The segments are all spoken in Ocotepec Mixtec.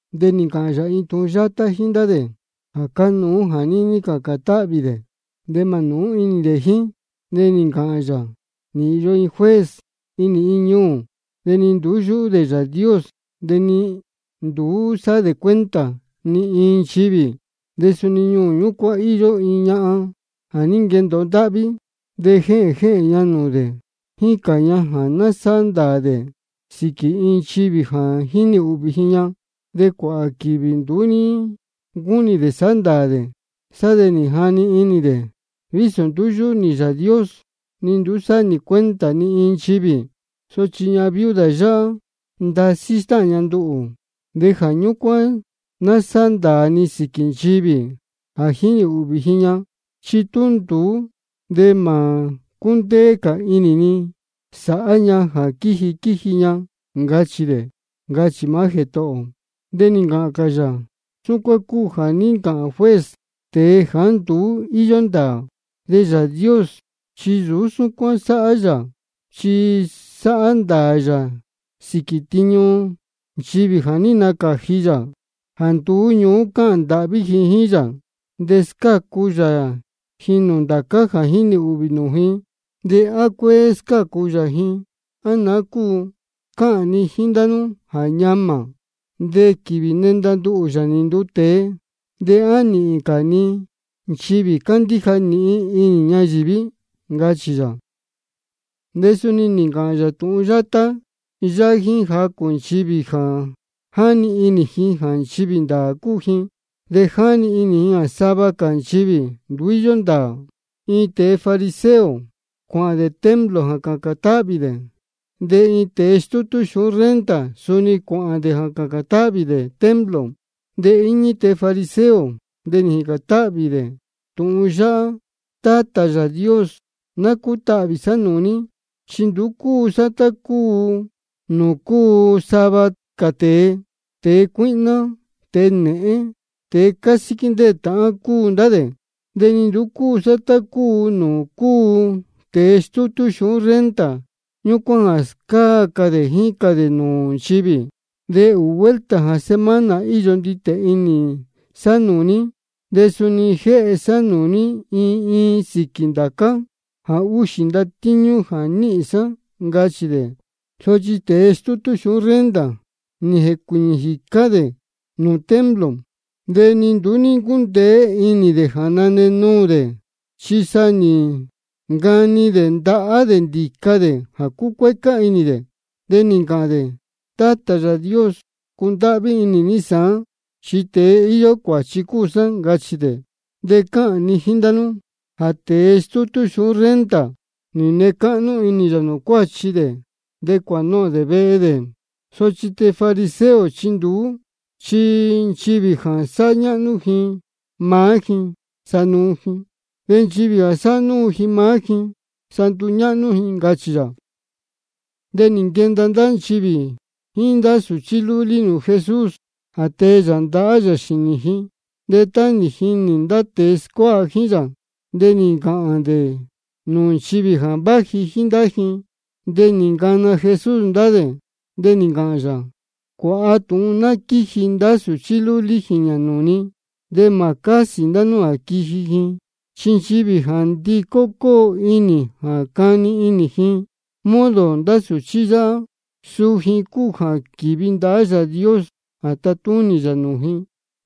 De nī ncāhān yā iin tūhun yátá jíín ndá dē jā cánuú jā níní cācān táhvī dē, de mā nūú inī dē jíín. De nī ncāhān yā: Nī īyo iin juez inī iin ñuū. De ni nduú yúhú dē Yāā Dios, de ni nduú sáhá dē cuenta ni iin nchivī. De suni ñuū ñúcuán íyó iin ñahan jā ní nquendōo ndáhví. De jéhēn jéhēn ña nūū dē, jícān ña jā ná sáhá ndāā dē sīquī iin nchivī jā jínī ūhvī ji ña. De cuāhā quīvī nduú ní ncúnī dē sāhá ndāā dē, sá de nī jani inī dē: Vísō nduú yúhú nī Yāā Dios ni nduú sáhá nī cuenta ni iin nchivī, sochi ñahan viuda yáhá, ndasí stáhān ña nduhū, de jā ñúcuán ná sáhá ndāā ni sīquī nchivī jā jínī ūhvī ji ña. Chi tú nduú de mā cúndéé cā inī ni sāhá ña jā quíji quíji ña, ncachī dē, ncachī maá Jētohō ō. De nī ncāhān cā yā: Súcuán cúu jā ní ncāhān juez, tēe jāá nduú íyó ndāā. De Yāā Dios chi nsūú súcuán sáhá yā, chi sáhá ndāā yā sīquī tiñu nchivī jā ní nacāji yā jā nduú ñuú cáhān ndāhví ji jíín yā. Chi scácu yā ji nūū ndācá jā jínī ūhvī nūū ji. ¿De á cuéé scácu yā ji, á naá cúu? Cáhān ni jíín ndá nú jā ñamā. De quīvī nenda nduhū, Yāā nī nduu tēe, ¿de á nīhīn cā ni nchivī cándíja nīhin inī ñayīví? ncachī yā. De suni nī ncāhān yā tūhun yátá yáhá jíín jacū nchivī jā jáni inī ji jā nchivī ndāā cúu ji, de jáni inī ji jā sava cā nchivī nduú íyó ndāā: Iin tēe fariseo cuāhān dē templo jā cācān táhvī dē. De iin tēe stútú xūhún renta suni cuāhān dē jā cācān táhvī dē templo. De íñí tēe fariseo, de nī jīcān táhvī dē tūhun yáhá: Tátā Yāā Dios, ná cútahvī sá nūū ní, chi nduú cúu sá tá cúu nūū cúu sava cā tēe, tēe cuíhná, tēe nēhén, tēe cásíquí ndéē tāhán cúu ndá dē. De ni nduú cúu sá tá cúu nūū cúu tēe stútú xūhún renta ñúcuán jā scáa cā dē jícān dē nūū nchivī. De ūū vuelta jā semana íyó nditē inī sá nūū ní, de suni jéhe sá nūū ní iin iin sīquī ndācá jā úxī ndatíñú jā níhīn sá, ncachī dē. Sochi tēe stútú xūhún renta, nī jēcuīñī jīcá dē nūū templo, de ni nduú ní ncúndéé inī dē jā nane nuū dē, chi sa nī ncani dē ndahá dē ndīca dē jā cúcuécá inī dē. De nī ncāhān dē: Tátā Yāā Dios, cundáhví inī ní sāán, chi tēe íyó cuāchi cúu sá, ncachī dē. De cáhān ni jíín ndá nú jā tēe stútú xūhún renta, nī nee cáhnú inī yā nūū cuāchi dē, de cuānohōn dē vehe dē. Sochi tēe fariseo, chi nduú. Chi nchivī jā sáhá ñáhnú ji maá ji, sa nuu ji. De nchivī jā sáhá núu ji maá ji, sa nduñáhnú ji, ncachī yā. De nī nquenda ndá nchivī jíín ndá sūchí lúlí nūū Jesús, jā tee yā ndahá yā xīnī ji. De tá nī jinī ndá tēe scuáha jíín yā, de nī ncāhān dē nūū nchivī jā váji jíín ndá ji. De nī ncana Jesús ndá dē, de nī ncāhān yā: Cuāha tūhun ná quíji ndá sūchí lúlí jīñā nūū ni, de mā cásī ndá nú jā quiji ji. Chi nchivī jā ndicó cóo inī ji jā cani inī ji modo ndá sūchí yáhá, suu ji cúu jā quīvi ndahá Yāā Dios jā tatúnī yā nūū ji.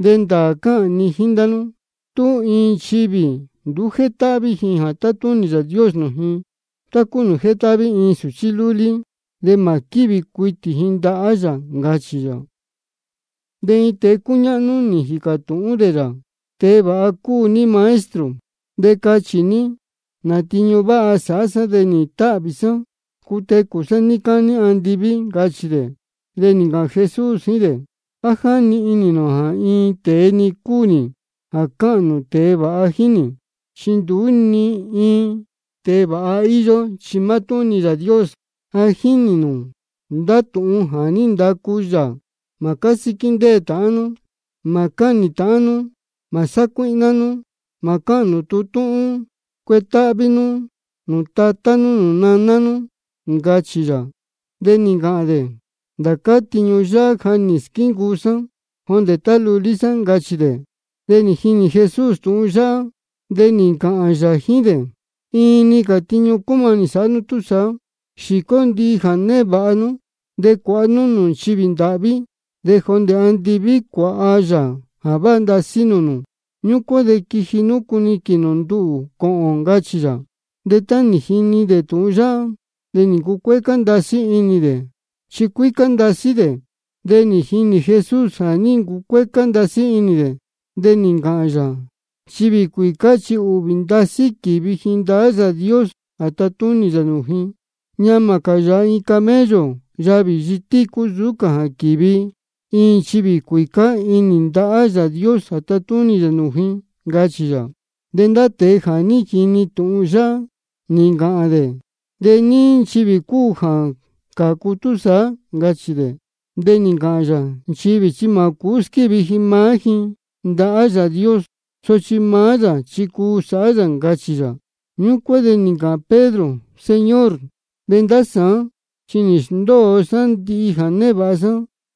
De ndāā cáhān ni jíín ndá nú, tú iin nchivī nduú jétáhví ji jā tatúnī Yāā Dios nūū ji, tá cúu nūū jétáhví iin sūchí lúlí, de mā quívi cuitī ji ndahá yā, ncachī yā. De iin tēe cúñáhnú nī jīcā tūhún dē yā: Tēe vāha cúu ní Maestro. De cachī ní, ¿nā tiñu váha sāhá sá de nīhīn táhvī sá cutecū sá níí cání andiví? ncachī dē. De nī ncāhān Jesús jíín dē: ¿A jáni inī nū jā iin tēe-ni cúu nī jā cáhān nū tēe vāha jíín nī? Chi nduú ni iin tēe vāha íyó, chi mátúhún-ni Yāā Dios. Ja jínī nū ndá tūhun jā ní ndacu yā: Mā cásíquí ndéē tāhán nú. Mā cáhnī nū ndīyi. Mā sácuíhná nú. Mā cáhān nū tūhun túhún. Cuetáhví nú nūū tatá nú nūū naná nú, ncachī yā. De nī ncāhān dē: Ndācá tiñu yáhá ja nī squíncuu sá jondē tá lulí sá, ncachī dē. De nī jini Jesús tūhun yáhá, de nī ncāhān yā jíín dē: Iin-ni cā tiñu cúmanī sāhá nú túsaá. Xīcó ndihi jā névāha nú, de cuāha nú nūū nchivī ndāhví. De jondē andiví cuāha yā jā váha ndasí nūū nū. Ñúcuán de quiji nú cuniquīn nū nduhū cōhōn, ncachī yā. De tá nī jini dē tūhun yáhá, de nī ncucuécá ndasí inī dē, chi cuícá ndasí dē. De nī jinī Jesús jā ní ncucuécá ndasí inī dē, de nī ncāhān yā: Nchivī cuīcá chi ūhvī ndasí quívi ji ndahá Yāā Dios jā tatúnī yā nūū ji. Ñamā cā yāha iin camello yavī yitícu nsūú cā jā quīvi iin nchivī cuīcá inī ndahá Yāā Dios jā tatúnī yā nūū ji, ncachī yā. De ndá tēe jā ní jini tūhun yáhá, nī ncāhān dē: ¿De ní nchivī cúu jā cācu túsaá? ncachī dē. De nī ncāhān yā: Nchivī chi mā cūú squívi ji maá ji ndahá Yāā Dios, sochi maá yā chi cuu sāhá yā, ncachī yā. Ñúcuán de nī ncāhān Pedro: Señor, de ndá sāán chi nī sndóo sá ndihi jā névāha sá,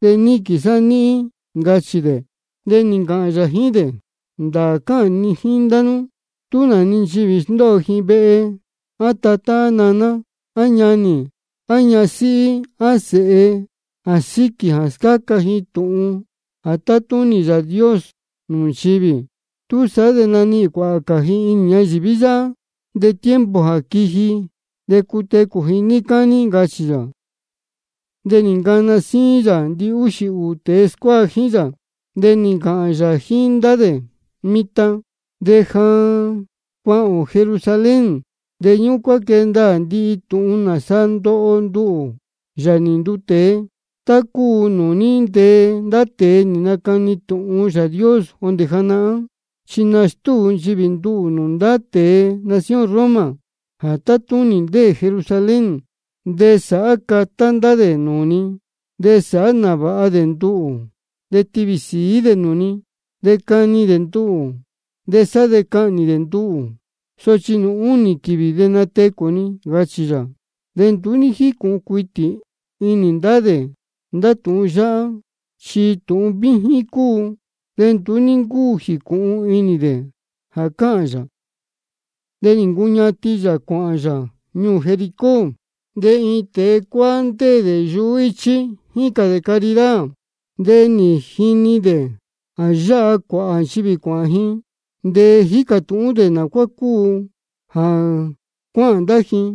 de níquīn sá níhín, ncachī dē. De nī ncāhān yā jíín ndá dē: Ndāā cáhān ni jíín ndá nú, tú nā-ni nchivī sndóo ji vehe, á tatá, á naná, á ñanī, á ñasíhí, á sēhe, jā síquī jā scáca ji tūhun jā tátúnī Yāā Dios nūū nchivī, túsaá de nanihīn cuāhā cā ji inī ñayīví yáhá, de tiempo jā quiji de cutecū ji níí cání, ncachī yā. De nī ncana síín yā ndihúxī ūū tēe scuáha jíín yā, de nī ncāhān yā jíín ndá dē: Mitan de ja cuāhān ō Jerusalén. De ñúcuán quee ndaā ndihi tūhun nāsa ndoho nduhū, Yāā nī nduu tēe, tá cúu nūū ní ntee ndá tēe nī nacani tūhun Yāā Dios jondē janahán. Chi nastúu nchivī nduhū nūū ndá tēe nación Roma jā tátúnī jā ndéē Jerusalén. De sāhá catá ndá dē nūū ni, de sāhá nāvāha dē nduhū, de tivī sīí dē nūū ni. De cani dē nduhū, de sá de cahnī dē nduhū. Sochi nūū únī quīvī de natecū ni, ncachī yā. De nduú ní jícūhun cuitī inī ndá dē ndá tūhun yáhá. Chi tūhun víjín cúu, de nduú ní ncúu jīcūhun inī dē jā cáhān yā. De nī ncuñatin yā cuāhān yā ñuū Jericó. De iin tēe cuáá ndéē dē yuhú íchí, jícān dē caridad. De nī jini dē jā yáha cuāhā nchivī cuāhān ji, de nī jīcā tūhún dē nā cuá cúu jā cuáhān ndá ji.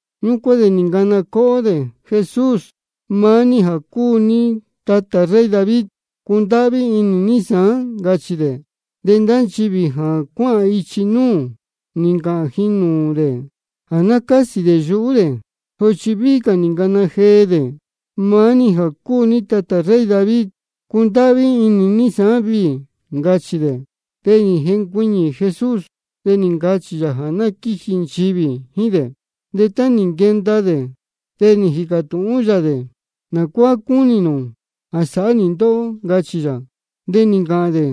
Ñúcuán de nī ncana cóhó dē: Jesús, maá ní jā cúu ní tatā rey David, cundáhví inī ní sāán, ncachī dē. De ndá nchivī jā cuáhān ichi núū, nī ncāhān ji nūū dē jā ná cásī dē yuhú dē. Sochi víhí cā nī ncana jee dē: Maá ní jā cúu ní tatā rey David, cundáhví inī ní sāán viī, ncachī dē. De nī jencuiñī Jesús, de nī ncachī yā jā ná quíji nchivī jíín dē. De tá nī nquenda dē, de nī jīcā tūhún yā dē: ¿Nā cuá cúnī nū jā sāhá nī ndóhó? ncachī yā. De nī ncāhān dē: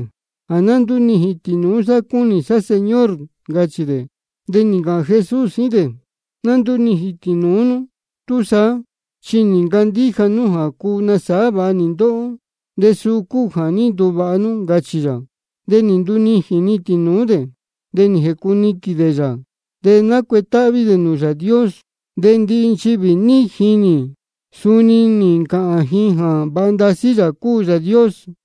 Jā ná ndúnijīn tīnūú sá cúnī sá, Señor, ncachī dē. De nī ncāhān Jesús jíín dē: Ná ndúnijīn tīnūú nú túsaá. Chi nī ncandíja nú jā cuu nasāhá vāha nī ndóhó, de suu cúu jā ní nduvāha nú, ncachī yā. De nī ndunijīn-ni tīnūú dē, de nī jēcuniquīn dē yā, de nácuetáhví dē nūū Yāā Dios. De ndihi nchivī jā ní jinī, suni nī ncāhān ji jā vāha ndasí Yāā cúu Yāā Dios.